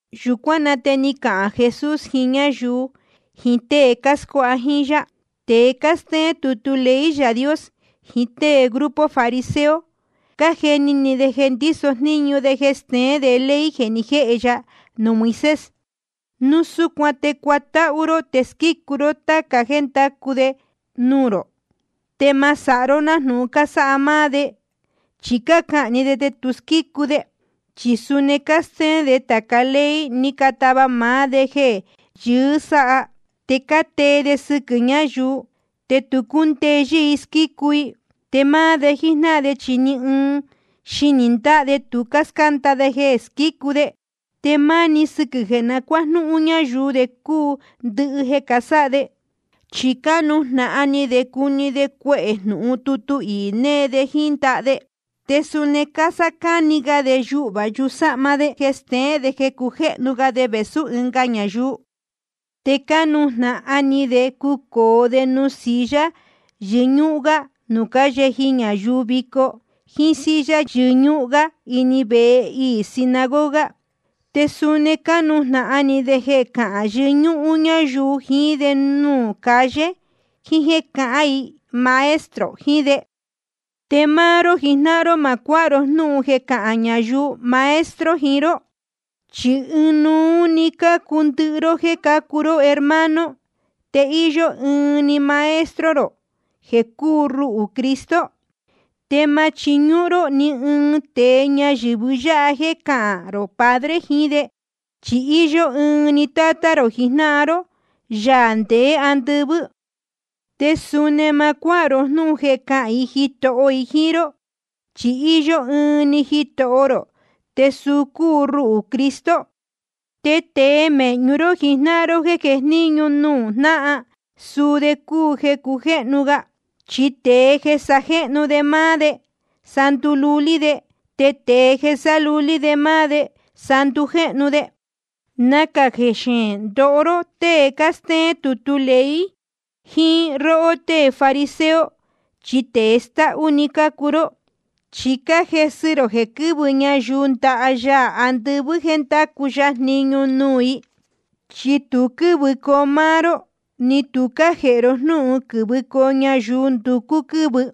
Yūcuán na te ni cahān Jesús jiín ñáyuu jiín tée cáscuáha jíín yá: Tēe cástéén tutu ley Yaā Dios jiín tée grupo fariseo, cájeni ni de jeē ndíso jníñu de jeē steén de ley jeē ni jéhe ya nuū Moisés. Núu súcuan te cuatáhú ró te squícu ró táca jéē cándacu de nuū rō. Te ma sáha ró nájnūhun cásáha máá de. Chi cácahān‑ni de, te tu cásquícu de. Chi suni cástéén de tāca ley ni catava maá de jeē yɨɨ́ sáha, te cátee de sɨquɨ̄ ñáyuu, te tu cácundeyɨ́ i squícu i. Te máá de jíjnáhan de, chi ni ɨɨn xinī ndáha de tu cáscánda de jeē squícu de. Te máni sɨquɨ̄ jeē na cuájnúhún ñáyuu de cúu ndɨhɨ jeē casáha de. Chi cánujnahan ni de cuhni de cuehē jnūhun tutu iī jneē de jíín ndaha de. Te suni cásácáni ga de yuhvā yusáhma de jeē steén jeē cácujéhnu ga de vēsú ɨnga ñayuu. Te cánujnahan ni de cucōo de nuū silla yɨñúhún gá nuū cáyeji ñayuu vico, jíín silla yɨñúhún gá ini vehe iī sinagoga. Te suni cánujnahan ni de jeē cahán yɨñúhún ñáyuu jiín de nuū calle, jiín jéē cahán i maestro jiín de. ’Te máá ró jijnáhan ró, ma cuáha ró jnúhun jeē cahán ñayuu maestro jiín ró. Chi ɨnuú cácuu ndɨhɨ ró jéē cácuu ró hermano, te íyó ɨɨn‑ni Maestro rō jeē cúu ruhū, Cristo. Te ma chiñúhún ró ni ɨɨn tēe ñayɨ̄vɨ yáha jeē cahán rō padre jiín de. Chi íyó ɨɨn‑ni Tátá rō jijnáhan ró, Yaā ndeé andɨvɨ́. Te suni ma cuáha ró jnúhun jeē cahán i jitoho jiín ró. Chi íyó ɨɨn‑ni Jitoho rō, te suu cúu ruhū, Cristo. Te tēe mēhñu ró jijnáhan ró jeē jejníñu nuū jnáhan, suu de cúu jeē cujéhnu ga. Chi tēe jeē sajéhnu de máá de, sa ndululí de. Te tēe jeē sálulí de máá de, sa ndujéhnu de. ’Nacā xeēn ndoho róhó tée cástéén tutu ley jiín róhó tée fariseo, chi tēe stáhú‑ni cácuu ró. Chi cájesɨ rō jeē quɨ́vɨ ñayuu ndaha Yaā andɨvɨ́ jéē ndacu ya jniñu nuū i. Chi tu quɨ́vɨcoo máá ró, ni tu cájēhe ro jnúhun quɨ̄vɨcoo ñayuu nducú quɨ́vɨ.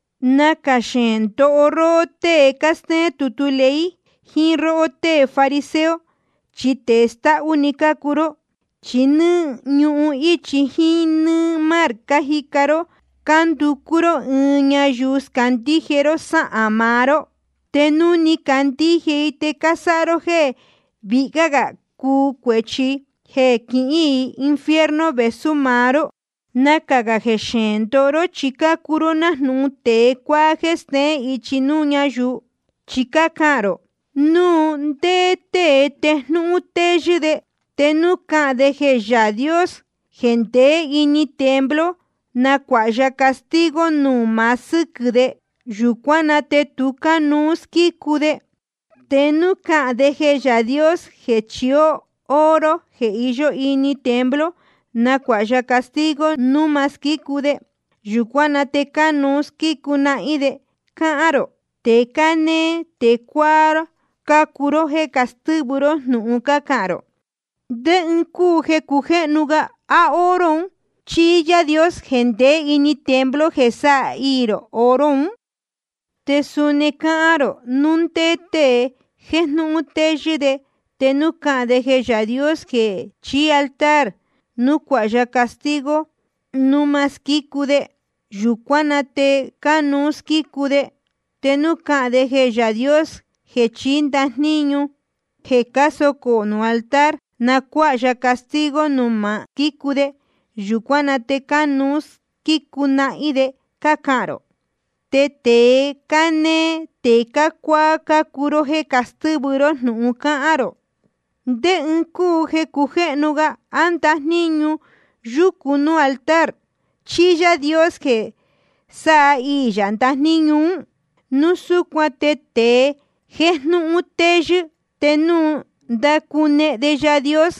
’Nacā xeēn ndoho róhó tée cástéén tutu ley jiín róhó tée fariseo, chi tēe stáhú‑ni cácuu ró. Chi nɨ́ɨ́ ñuhun íchi jíín nɨ́ɨ́ mar cájica cuu ró cánducú ró ɨɨn ñayuu scandíje ró sáhān maá ró. Te núu ni candíje i, te cásáha ró jéē vihyá gā cúu cuēchi i jeē quihín i infierno vēsú maá ró. ’Nacā xeēn ndoho ró, chi cácuu ró nájnūhun tēe cuáá jéē steén ichi nuū ñáyuu. Chi cácahān rō: Núu ndé tée jéjnūhun téyɨ́ de, te núu cahān de jeē Yaā Dios jeē ndeé ini templo na cuáha ya castigo núu ma squícu de, yūcuán na te tu cánuú squícu de. Te núu cahān de jeē Yaā Dios jeē chií oro jeē iyó ini templo, na cuáha ya castigo núu ma squícu de, yūcuán na te cánuú squícu nahín de, cácahān rō. Tēe cánéé tēe cuáá cácuu ró jéē castɨ́vɨ ró jnūhun cácahān rō. ¿Ndé ɨɨn cúu jeē cujéhnu ga, á oro un chí Yaā Dios jeē ndeé ini templo jeē sáhiī oro un? Te suni cácahān rō: Núu ndé tée jéjnūhun téyɨ́ de, te núu cahān de jeē Yaā Dios jeē chií altar na cuáha ya castigo núu ma squícu de, yūcuán na te tu cánuú squícu de. Te núu cahān de jeē Yaā Dios jeē chií ndajníñu jeē cásocō nuū altar, na cuáha ya castigo núu ma squícu de, yūcuán na te cánuú squícu nahín de, cácahān rō. Tēe cánéé tēe cuáá cácuu ró jéē castɨ́vɨ ró jnūhun cácahān rō. ¿Ndé ɨɨn cúu jeē cujéhnu ga, á ndajníñu yúcu nuū altar, chí Yaā Dios jeē sáhiī yā ndajníñu ún? Núu súcuan te tēe jéjnūhun téyɨ́, te núu ndácunehen de Yaā Dios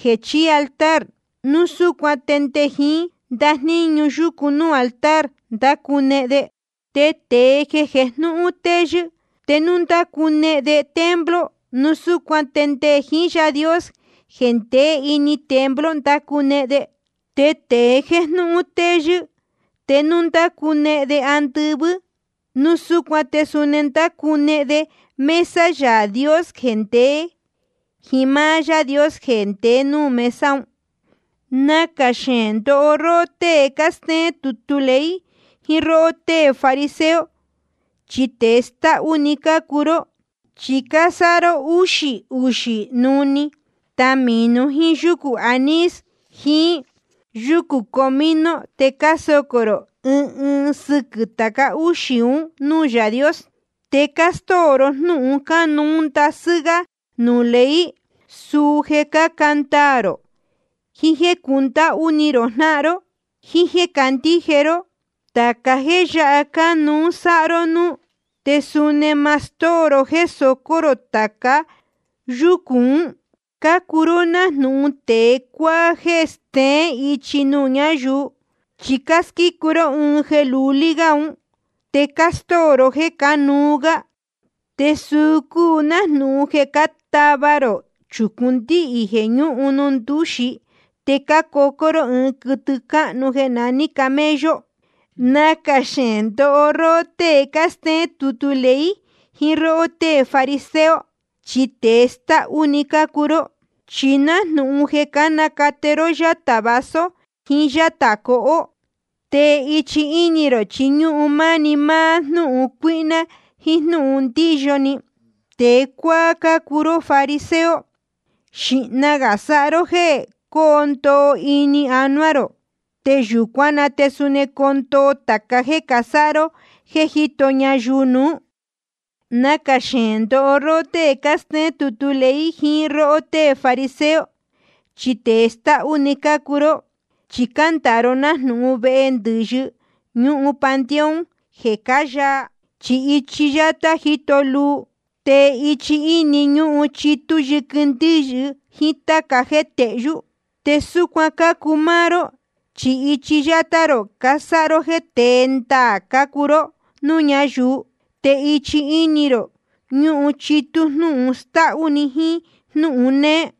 jeē chií altar, núu súcuan te nde jiín ndajníñu yúcu nuū altar ndácunehen de. Te tēe jeē jéjnūhun téyɨ́, te núu ndácunehen de templo, núu súcuan te nde jiín Yaā Dios jeē ndeé ini templo ndácunehen de. Te tēe jéjnūhun téyɨ́, te núu ndácunehen de andɨvɨ́, núu súcuan te suni ndácunehen de mesa Yaā Dios te nde jiín máá Yaā Dios jeē ndeé nuū mesa un. ’Nacā xeēn ndoho róhó tée cástéén tutu ley jiín róhó tée fariseo, chi tēe stáhú‑ni cácuu ró. Chi cásáha ró úxī uxī nuhnī tamīnú jiín yucū anís jiín yucū comino, te cásocō rō ɨɨn ɨɨn sɨquɨ̄ tāca úxī un núū Yaā Dios. Te cástóo ró jnúhun cánuú ndasɨ́ gá nuū ley, suu jeē cáca ndaā rō, jiín jéē cundáhú ni rō jnáhan ró, jíín jéē candíje ró. Tāca jéē yáha cánuú sáha ró núú, te suni ma stóo ró jéē socó rō tāca yúcū ún. Cácuu ró nájnūhun tēe cuáá jéē steén ichi nuū ñayuu. Chi cásquícu ró ɨɨn jeē lulí gá un, te cástóo ró jéē cánuú gá. Te suu cúu nájnūhun jeē cátava rō chūcún ndíhī jeē ñúhun nuū ndúxi, te cácocó ró ɨɨn quɨtɨ cáhnu jeē naní camello. ’Nacā xeēn ndoho róhó tée cástéén tutu ley jiín róhó tée fariseo, chi tēe stáhú‑ni cácuu ró. Chi nájnūhun jeē cánacate ró yátā vaso jiín yátā cohó. Te ichi íni rō chi ñúhun máni máá jnúhun cuíhná jíín jnúhun ndíyo ni. Tēe cuáá cácuu ró, fariseo. Xīhna gā sáha ró jéē coo ndoo ini anuá rō, te yūcuán na te suni coo ndoo tāca jéē casáha ró jéē cájito ñayuu nuū. ’Nacā xeēn ndoho róhó tée cástéén tutu ley jiín róhó tée fariseo, chi tēe stáhú‑ni cácuu ró. Chi cándāa ró nájnūhun vehe ndɨ̄yɨ nuū panteón jeē cáyaa. Chi ichi yátá jíto luu, te ichi íni ñúhun chitú yɨquɨ ndɨ́yɨ jiín táca jéē tehyú. Te súcuan cácuu máá ró, chi ichi yátá rō casáha ró jeē tée ndaā cácuu ró núū ñáyuu. Te ichi íni rō ñúhun chitú jnúhun stáhú‑ni jíín jnúhun néé.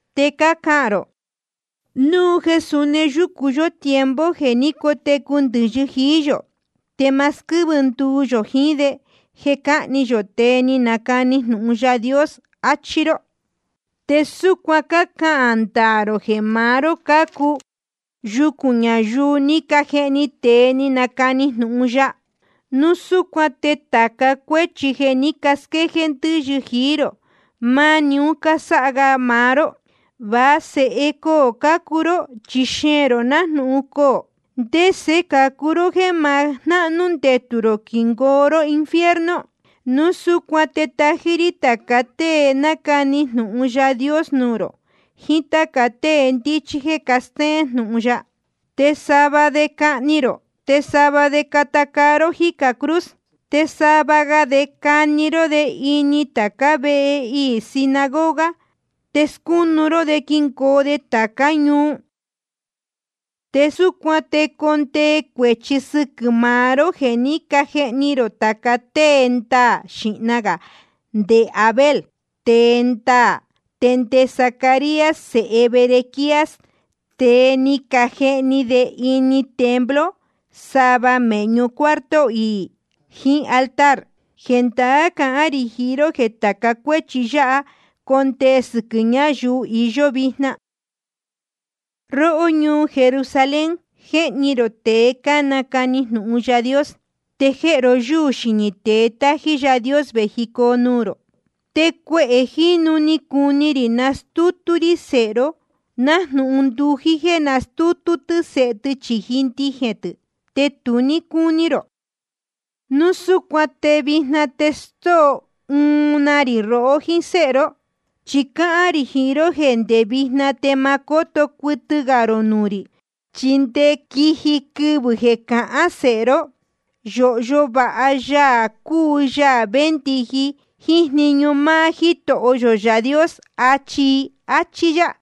Te cácahān rō: Núu jeē suni yúcu yó tiempo jeē ní cotecu ndɨ̄yɨ jií yō, te ma squɨ́vɨ nduu yō jiín de jeē cáhni yō tēe ni canacani jnūhun Yaā Dios, achí ró. Te súcuan cácahān ndaā rō jeē maá ró cácuu yucūn ñayuu ni cajehni tēe ni canacani jnūhun ya. Núu súcuan te tāca cuéchi jeē ní casquéjéé ndɨ́yɨ jií rō, máni un cásáha ga maá ró. ’Va sēhe coō cácuu ró, chi xeēn rō nájnūhun coō. ¿Ndese cācu ró jéē ma jnahnú ndetū rō quingoo ró infierno? Núu súcuan te tají rí tāca tée nacani jnūhun Yaā Dios nuū rō, jiín táca tée ndíchí jéē castéén jnūhun ya. Te sava de cahni rō, te sava de cata caa ró jicā cruz. Te sava ga de cani ró de ini tācá vehe iī sinagoga, te scúnu ró de quingoo de tācá ñuu. Te súcuan te condee cuēchi sɨquɨ̄ maá ró jeē ní cajehni jií rō tāca tée ndaā, xīhna gā nde Abel tēe ndaā, te nde Zacarías sēhe Berequías, tēe ni cajehni de ini templo sava mēhñu cuarto iī jiín altar. Jendaá cahán rī jiín ró jeē tāca cuéchi yáha condee sɨquɨ̄ ñáyuu iyó vijna. ’Róhó ñuu Jerusalén, jéhni rō tēe cánacani jnūhun Yaā Dios, te jéhe ro yúū xinī tée tájí Yaā Dios vējicoo nuū rō. Te cuehē jínu ni cuni rī nastútú rí sēhe ró, nájnūhun ndují jéē nastútú tɨ́ sēhe tɨ chīji ndijēn tɨ̄, te tu ní cúní rō. Núu súcuan te vijna te stóo uun na ri rohó jíín séhe ró. Chi cáhán rī jiín ró jéē ndé vijna te ma cóto cuɨtɨ gā rō nuū rī, chi nde quiji quɨvɨ̄ jeē cahán sēhe ró: Yōhyo vāha Yaā cúu Yaā véndiji jíín jniñu máá Jítoho yō Yaā Dios, achi i. Achí yá.